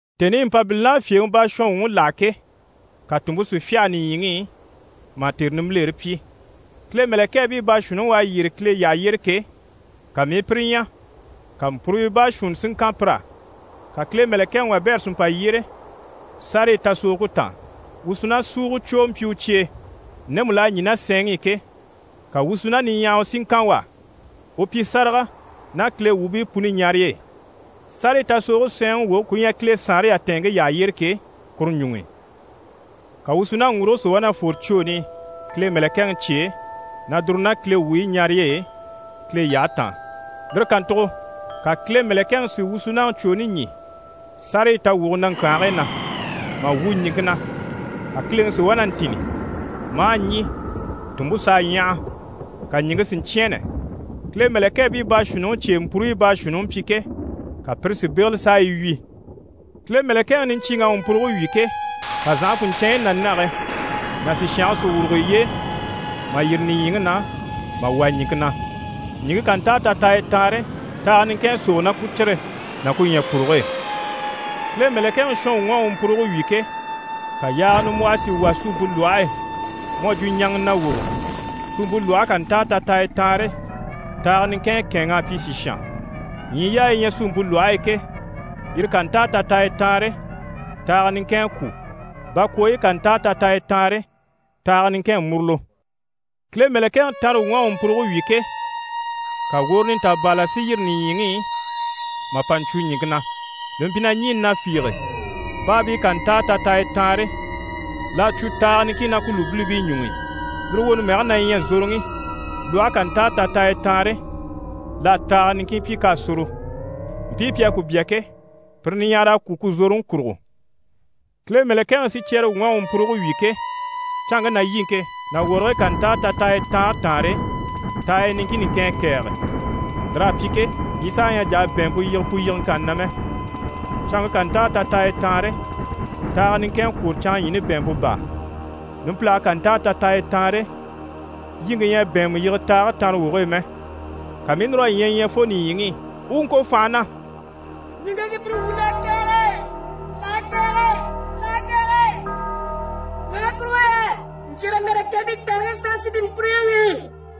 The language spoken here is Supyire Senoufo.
Tèni i Mpabilini à fyèŋi baashɔnwuŋi láha ke, ka tùnmpe si fyâha nìɲyiŋi i, mà tère nimbilere pyi. Kile mɛ̀lɛkɛɛbii baashuunniŋi u à yyére Kile yyaha yyére ke, ka mii i pire ɲya, ka mpuruyo baashuunni si ŋkan pir'á. Ka Kile mɛ̀lɛkɛŋi wabɛrɛ si mpa yyére sárayi tasogoge taan. Wusunasuugocwoo mpyi u cye e, ndemu l'à yaa ná sɛɛnŋi i ke. Ka wusuna niɲyahawa si ŋkan u á, u pyi sáraga ná Kile wuubii puni ɲarey'e, sárayi tasogoge sɛɛnŋi woge ku ɲyɛ Kile saanre yatɛɛnŋke yyaha yyére ke, kuru ɲuŋ'i. Ka wusunaŋi ŋguruge si wá na fwore cwooni i Kile mɛ̀lɛkɛŋi cye e, na dùru ná Kile wuubii ɲarey'e Kile yyahe taan. Lire kàntugo ka Kile mɛ̀lɛkɛŋi si wusunaŋi cwooni ɲî sárayi tawwuge naŋkyanhigii na, mà wu ɲìŋke na. Ka kileŋi si wá na ntînni, maa ɲî, tùnmpe s'à ɲyaha, ka ɲìŋke si ɲcyɛ̂ɛnnɛ. Kile mɛ̀lɛkɛɛbii baashuunniŋi cye e mpuruyi baashuunniŋi mpyi ke, ka pire si bégele s'a yi wyì. Kile mɛ̀lɛkɛŋi niɲcyiiŋ'à u mpuruge wyì ke, ka zànhafunɲcɛɛnɲyi ná nage ná sìshange si wùrugo yiye e mà yîri nìɲyiŋi na mà wà ɲìŋke na. Ɲìŋke ká ntáa tataaya taanre, taaga niŋkin à sógo ná ku cire ná ku ɲyɛ̀puruge e. Kile mɛ̀lɛkɛŋi shɔnwuŋ'à u mpuruge wyì ke, ka yaaga nimbwɔhɔ si wà suumpe lwɔhe e mu à jwo ɲaŋa nawogo. Suumpe lwɔhe ká ntáa tataaya taanre, taaga niŋkin à kɛ̂ɛnŋ'a pyi sìshan. Ɲyii yaayi yi ɲyɛ suumpe lwɔhe e ke, yire ká ntáa tataaya taanre, taaga niŋkin à kwû, bakwooyi ká ntáa tataaya taanre, taaga niŋkin à murulo. Kile mɛ̀lɛkɛŋi tanrewuŋ'à u mpuruge wyì ke, ka woro nintabaala si yîri nìɲyiŋi i mà mpa ɲcwo ɲìŋke na. Li mpyi na ɲî na fiige. Baabii ká ntáa tataaya taanre, l'à cwo taaga niŋkin ná ku lùbilibii ɲuŋ'i. Lire woni mɛge na ɲyɛ Zoroŋi. Lwɔhe ká ntáa tataaya taanre, l'à taaga niŋkin pyi k'à soro. Mpii pi à ku bya ke, pire niɲyahara à kwû ku zoroŋi kurugo. Kile mɛ̀lɛkɛŋi sicyɛrewuŋ'à u mpuruge wyì ke, canŋke ná yiŋke ná wɔrigii ká ntáa tataaya taanre taanre, taaya niŋkin niŋkin à kɛ̀ɛge. Lir'à pyi ke, yi saha ɲyɛ a jà a bɛ̀ɛnmpe yige pu yigeŋkanni na mɛ. Canŋke ká ntáa tataaya taanre, taaga niŋkin à kwôro canŋaɲyiini bɛ̀ɛnmpe baa. Numpilage ká ntáa tataaya taanre, yiŋke ɲyɛ a bɛ̀ɛnmɛ yige taage tanrawoge e mɛ. Ka mii i núr'a ɲyɛ ɲya fo nìɲyiŋi i, u u ŋko fànha na: «Ɲìŋke sùpyire wuun'à kɛ̀ɛge, l'à kɛ̀ɛge, l'à kɛ̀ɛge, ɲaha kurugo yɛ ɲcyɛ̀rɛ mɛ̀lɛkɛɛbii taanreŋi sanŋi sí pi mpuruyi wyì.»